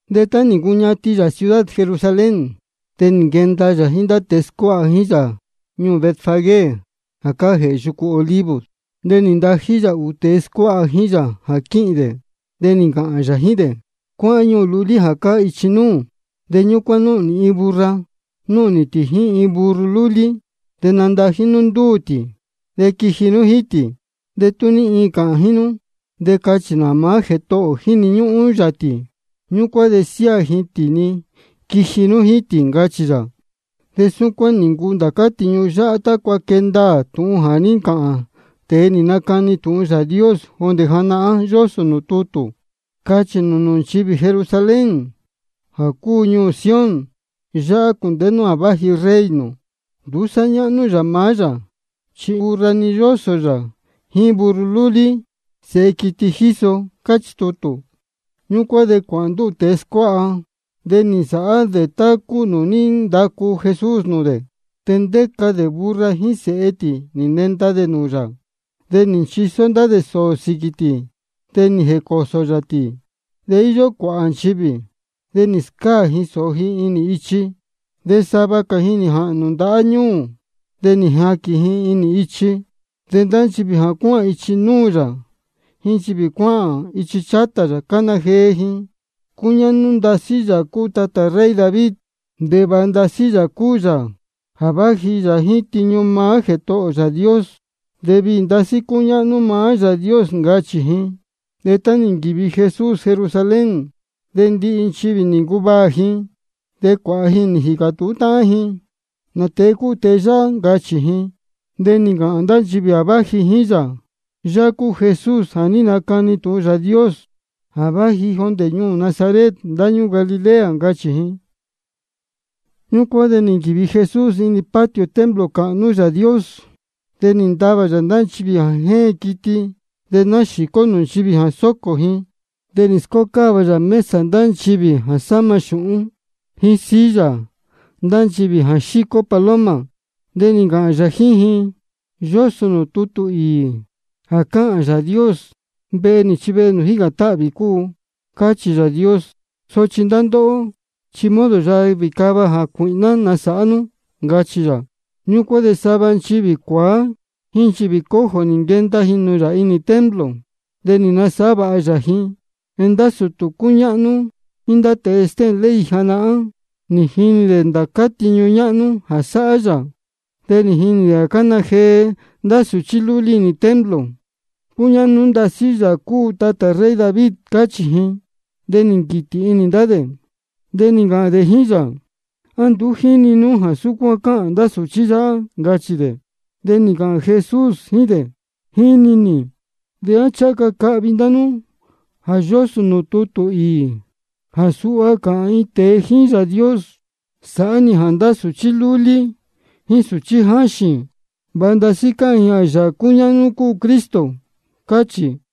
De tá nī ncuñatin yā ciudad Jerusalén, de nī nquenda yā jíín ndá tēe scuáha jíín yā ñuū Betfagé jā cáá jēhē yucu Olivos. De nī ntají yā ūū tēe scuáha jíín yā jā quíhīn dē. De nī ncāhān yā jíín dē: Cuáhán ñuū lulí jā cáá ichi núū. De ñúcuán nīhīn nū iin burra, núhnī tī jíín iin burro lúlí. De nandají nú ndúū tī, de quiji nú jíín tī. De tú ní iin cāhān jíín nú, de cachī nū jā maá Jētohō ō jíni ñúhún yā tī. Ñúcuán de siáā ji tī-ni quiji nú jíín tī, ncachī yā. De súcuán nī ncuu ndācá tiñu yáhá tácua quee ndaā tūhun jā ní ncāhān tēe nī nacani tūhun Yāā Dios jondē janahán, yósō nūū tutū: Cachī nū nūū nchivī Jerusalén jā cúu ñuū Sión: Yáhá cūndēhé nú jā váji Rey nū. Nduú sáhá ñáhnú yā maá yā, chi burra-ni yósō yā, jíín burro lúlí, sēhe quiti jíso. Cáchī tutū. Ñúcuán de cuāhān ndúū tēe scuáha, de nī nsāhá dē tá cúu nūū ní ndacu Jesús nūū dē. De ndéca dē burra jíín sēhe tī, nī nenda dē nūū yā. De nī nchisó ndá dē sōō dē sīquī tī, de nī jēcōsō yā tī. De íyó cuāhā nchivī, de nī scáā ji sōō ji inī ichi. De sava cā ji nī jāhnū ndahá ñūū, de nī jaquīn ji inī ichi. De ndá nchivī jā cuáhān ichi núū yā jíín nchivī cuáhān ichi chátā yā, cána jee ji: Cúñáhnú ndasí Yāā cúu tatā rey David. De vāha ndasí Yāā cúu yā jā váji yā jíín tiñu maá Jētohō ō Yāā Dios. De viī ndasí cúñáhnú maá Yāā Dios, ncachī ji. De tá nī nquīvi Jesús Jerusalén, de ndihi nchivī nī ncuvaā ji, de cuāhā ji nī jīcā tūhún táhán ji: ¿Nā tēe cúu tēe yáhá? ncachī ji. De nī ncāhān ndá nchivī jā váji jíín yā: Yāhá cúu Jesús jā nácani tūhun Yāā Dios, jā váji jondē ñuū Nazaret ndáñúū Galilea, ncachī ji. Ñúcuán de nī nquīvi Jesús inī patio templo cāhnú Yāā Dios. De nī ntavā yā ndá nchivī jā jéen quiti de náxīcó nūū nchivī jā sōcō ji. De nī scócáva yā mesa ndá nchivī jā sáma xūhún, jíín silla ndá nchivī jā xícó paloma. De nī ncāhān yā jíín ji: Yósō nūū tutū īī jā cáhān Yāā Dios: Vehe nī chi vehe nūū jícān táhvī cúu, cáchī Yāā Dios. Sochi ndá ndóhó, chi modo yavī cava jācuīhná nī nasāhá nú, ncachī yā. Ñúcuán de sava nchivī cuāá jíín nchivī cojo nī nquenda ji nūū yā inī templo. De nī nasāhá vāha yā ji. De ndá sūtū cúñáhnú jíín ndá tēe stéhēn ley janahán, nī jinī dē ndācá tiñu ñáhnú jā sáhá yā, de nī jini dē jā cána jee ndá sūchí lúlí inī templo: Cúñáhnú ndasí Yāā cúu tatā rey David, cáchī ji. De nī nquītī inī ndá dē. De nī ncāhān dē jíín yā: ¿A nduú jíni nú jā súcuán cáhān ndá sūchí yáhá? ncachī dē. De nī ncāhān Jesús jíín dē: Jíni nī. ¿De á ncháha ca cahvi ndá nú jā yósō nūū tutū īī jā suha cáhān iin tēe jíín Yāā Dios? Sāhá ní jā ndá sūchí lúlí jíín sūchí jáxīn, vāha ndasí cāhān ji jā Yāā cúñáhnú cúu Cristo. Cáchī.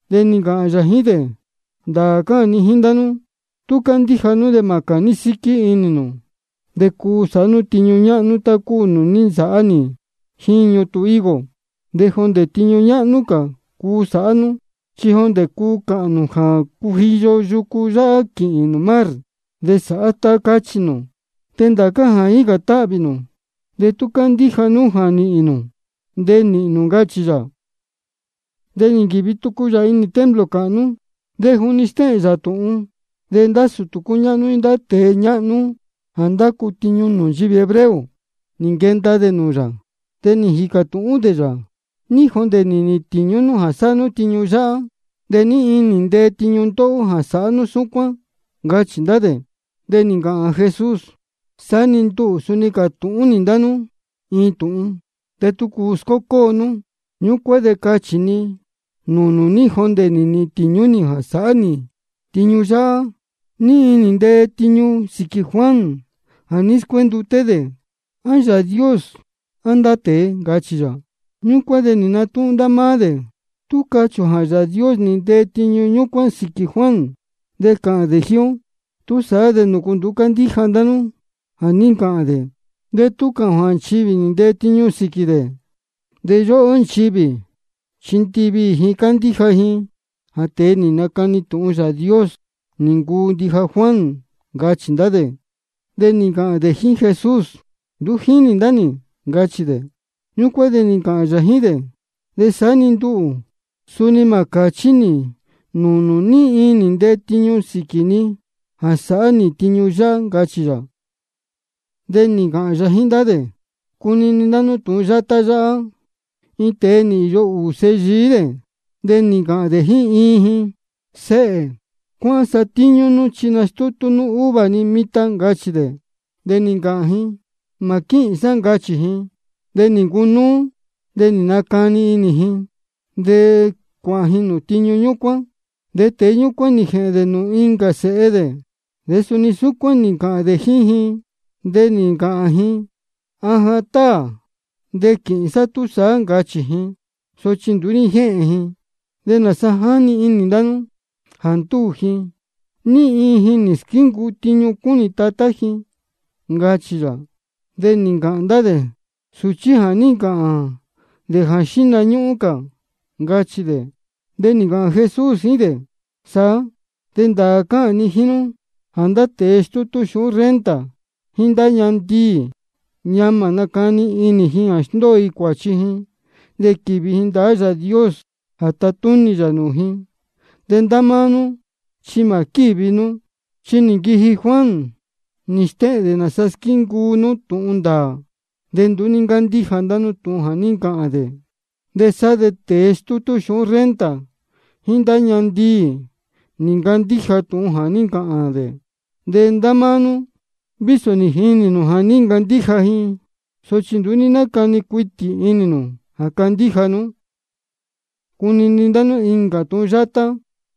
De nī ncāhān yā jíín dē: Ndāā cáhān ni jíín ndá nú, tú candíja nú de mā cāní síquí inī nū, de cuu sāhá nú tiñu ñáhnú tá cúu nūū ní nsāhá nī jíín ñutun higo. De jondē tiñu ñáhnú cā cuu sāhá nú, chi jondē cuu cāhān nū jā cujiyo yucu yáhá quīhīn nūū mar, de sāhá tá cáchī nū. De ndācá jā jícān táhvī ndá nú, de tú cándíja nú jā nīhīn nū, de nīhīn nū, ncachī yā. De nī nquīvi tucu yā inī templo cāhnú. De juni stéhēn yā tūhun, de ndá sūtū cúñáhnú jíín ndá tēe ñáhnú jā ndácu tiñu nūū nchivī hebreo, nī nquenda dē nūū yā. De nī jīcā tūhún dē yā: ¿Ní jondē nī nīhīn tīñú nú jā sáhá nú tiñu yáhá? ¿De ní iin nī ntee tiñu ndóhó jā sáhá nú súcuán? ncachī ndá dē. De nī ncāhān Jesús: Saá-ni nduhū suni cātūhún nī ndá nú iin tūhun, de tú cuu scócóo nú, ñúcuán de cachī ni nūū nū ní jondē nī nīhīn tīñú nī jā sáhá nī tiñu yáhá. ¿Ní iin nī ntee tiñu sīquī Juan jā ní scuénduté dē? ¿A Yāā Dios á ndá tēe? ncachī yā. Ñúcuán de nī natúhún ndá máá dē: Tú cachī ō jā Yāā Dios nī ntee tiñu ñúcuán sīquī Juan, de cāhān dē jíín ó: ¿Túsaá de nūcu nduú ní ncándíja ndá nú jā ní ncāhān dē? De tú cāhān ō jā nchivī nī ntee tiñu sīquī dē, de yúhú ó nchivī, chi ndiviī ji cándíja ji jā tēe nī nacani tūhun Yāā Dios nī ncuu ndija Juan, ncachī ndá dē. De nī ncāhān dē jíín Jesús: Nduú jínī ndá nī, ncachī dē. Ñúcuán de nī ncāhān yā jíín dē: De saá-ni nduhū, suni mā cāchí nī nūū nū ní iin nī ntee tiñu sīquī ni jā sáhá nī tiñu yáhá, ncachī yā. De nī ncāhān cā yā jíín ndá dē: Cunini ndá nú tūhun yátá yáhá: Iin tēe nī īyo ūū sēhe yií dē. De nī ncāhān dē jíín iin ji: Séhē, cuáhán satíñú nú chi nastútú nú uva ni mitan, ncachī dē. De nī ncāhān ji: Mā quíhīn sá, ncachī ji. De nī ncunúú, de nī nacani inī ji, de cuāhān ji nūū tiñu ñúcuán. De tēe ñúcuán nī jēhēn dē nūū incā sēhe dē, de suni súcuán nī ncāhān dē jíín ji. De nī ncāhān ji: Ajan táā, de quīhīn sá túsaá, ncachī ji. Sochi nduú ní jéhēn ji. ¿De nāsa jáni inī ndá nú? Jā ndúū ji, ¿ní iin ji nī squíncuu tiñu cúnī tatá ji? ncachī yā. De nī ncāhān ndá dē: Sūchí jā ní ncāhān dē jíín xihna cā, ncachī dē. De nī ncāhān Jesús jíín dē: Saá, de ndāā cáhān ni jíín nú jā ndá tēe stútú xūhún renta jíín ndá ñahan ndiī, ñamā nácani inī ji jā sndóo ji cuāchi ji de quīvi ji ndahá Yāā Dios jā tatúnī yā nūū ji, de ndá máá nú chi mā quívi nú. Chi nī nquiji Juan, nī stéhēn dē nāsa squíncuu nú tūhun ndāā, de nduú ní ncándíja ndá nú tūhun jā ní ncāhān dē. De sa ndá tēe stútú xūhún renta jíín ndá ñahan ndiī, nī ncandíja ji tūhun jā ní ncāhān dē. De ndá máá nú, vísō nī jinī nū jā ní ncandíja ji, sochi nduú ní nácani cuitī inī nū jā candíja nú. Cunini ndá nú incā tūhun yátá: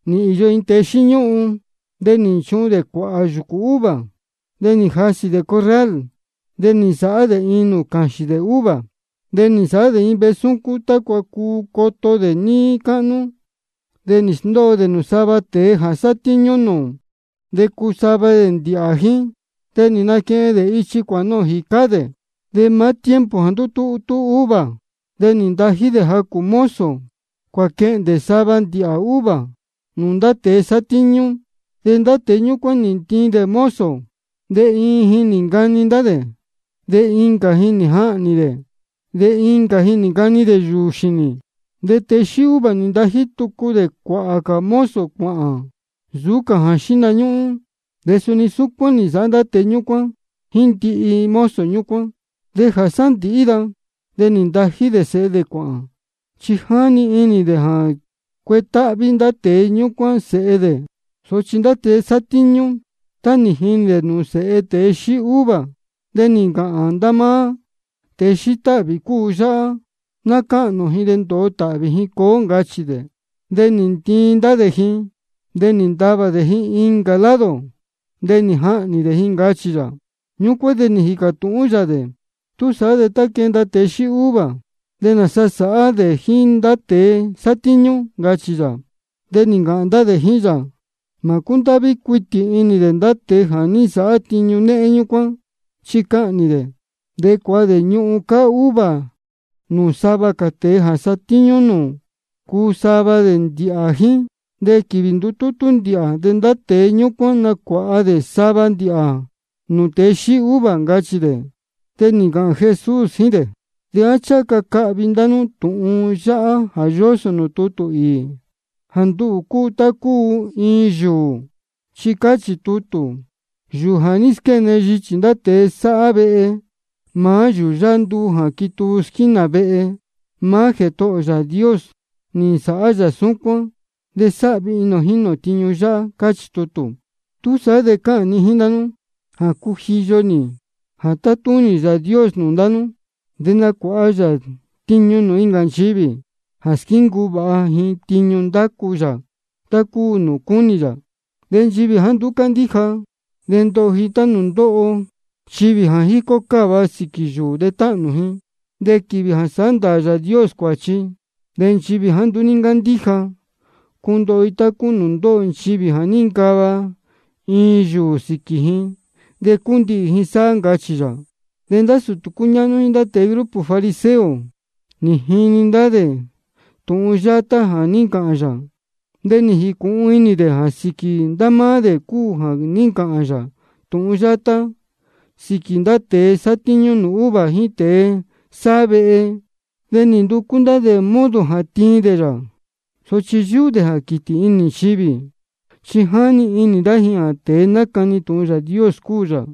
Nī īyo iin tēe xíñúhun. De nī nchuhun dē cuāhā yūcū uva. De nī jasī dē corral, de nī nsāhá dē iin nūū cāxīn dē uva. De nī nsāhá dē iin vehe súcún tácua cuu coto dē níí cáhnú. De nī sndóo dē nūū sava tēe jā satíñú nūū, de cuu sava dē ndīhā jíín. De nī nquehen dē ichi cuāhān jīcá dē. De maá tiempo jā ndutútú uva, de nī ntají dē jacū mozo cuāquēhen sava ndīhā uva nūū ndá tēe sátíñú. De ndá tēe ñúcuán nī ntiin dē mozo. De iin ji nī ncani ndá dē, de incā ji nī jahnī dē, de incā ji nī ncani dē yūū xīnī. De tēe xíí uva nī ntají tucu dē cuāhā cā mozo cuāhān nsūú cā jā xíhna ñúhún. De suni súcuán nī nsāhá ndá tēe ñúcuán jíín ndihi mozo ñúcuán. De jā sándīhí da, de nī ntají dē sēhe dē cuāhān. Chi jáni inī dē jā cuetáhví ndá tēe ñúcuán sēhe dē. Sochi ndá tēe sátíñú, tá nī jinī dē nūū sēhe tēe xíí uva, de nī ncāhān ndá máá: Tēe xíí táhvī cúu yáhá. Ná cáhnī ō ji, de ndōo tāhvī ji cuu ó, ncachī. De nī ntiin ndá dē ji, de nī ntavā dē ji incā lado, de nī jahnī dē ji, ncachī yā. Ñúcuán de nī jīcā tūhún yā dē: Túsaá de tá quenda tēe xíí uva, ¿de nāsa sāhá dē jíín ndá tēe sátíñú? ncachī yā. De nī ncāhān ndá dē jíín yā: Mā cúndáhví cuitī inī dē ndá tēe jā ní nsāhá tiñu néhén ñúcuán, chi cahnī dē. De cuāha dē ñuhun cáá uva nūū sava cā tēe jā satíñú nūū, cuu sava dē ndīhā jíín. De quīvī ndutútú ndīhā, de ndá tēe ñúcuán nacuāha dē sava ndīhā nūū tēe xíí uva, ncachī dē. De nī ncāhān Jesús jíín dē: ¿De á ncháha ca cahvi ndá nú tūhun yáhá jā yósō nūū tutū īī, jā nduhū cúu tá cúu iin yūū? Chi cáchī tutū: Yūū jā ní squéne yichī ndá tēe jā sáhá vehe, maá yūū yáhá nduu jā quituu squínā vehe. Maá Jētohō ō Yāā Dios nī nsāhá yā súcuán, de sáhvi inī ō jínī ō tiñu yáhá. Cáchī tutū. Túsaá de cáhān ni jíín ndá nú jā cujiyo-ni jā tátúnī Yāā Dios nūū ndá nú, de nacuāha yā tiñu nūū incā nchivī jā squíncuu vāha ji tiñu ndácu yā tá cúu nūū cúnī yā. De nchivī jāá nduú cándíja, ndoho ji tá cúu nūū ndóho nchivī jā jícó cáva sīquī yūū de táhnū ji. De quīvī jā sāhá ndāā Yāā Dios cuāchi, de nchivī jāá nduú ní ncándíja, cundoho ji tá cúu nūū ndóho nchivī jā níncava iin yūū sīquī ji de cúndihī ji sáhá, ncachī yā. De ndá sūtū cúñáhnú jíín ndá tēe grupo fariseo nī jini dē ndá tūhun yátá jā ní ncāhān yā. De nī jīcūhun inī dē jā sīquī ndá máá dē cúu jā ní ncāhān yā tūhun yátá sīquī ndá tēe sátíñú nūū uva jíín tēe sáhá vehe. De nī nducú ndá dē modo jā tiin dē yā. Sochi yúhú dē jā quītī inī nchivī, chi jáni inī ndá ji jā tēe nácani tūhun Yāā Dios cúu yā.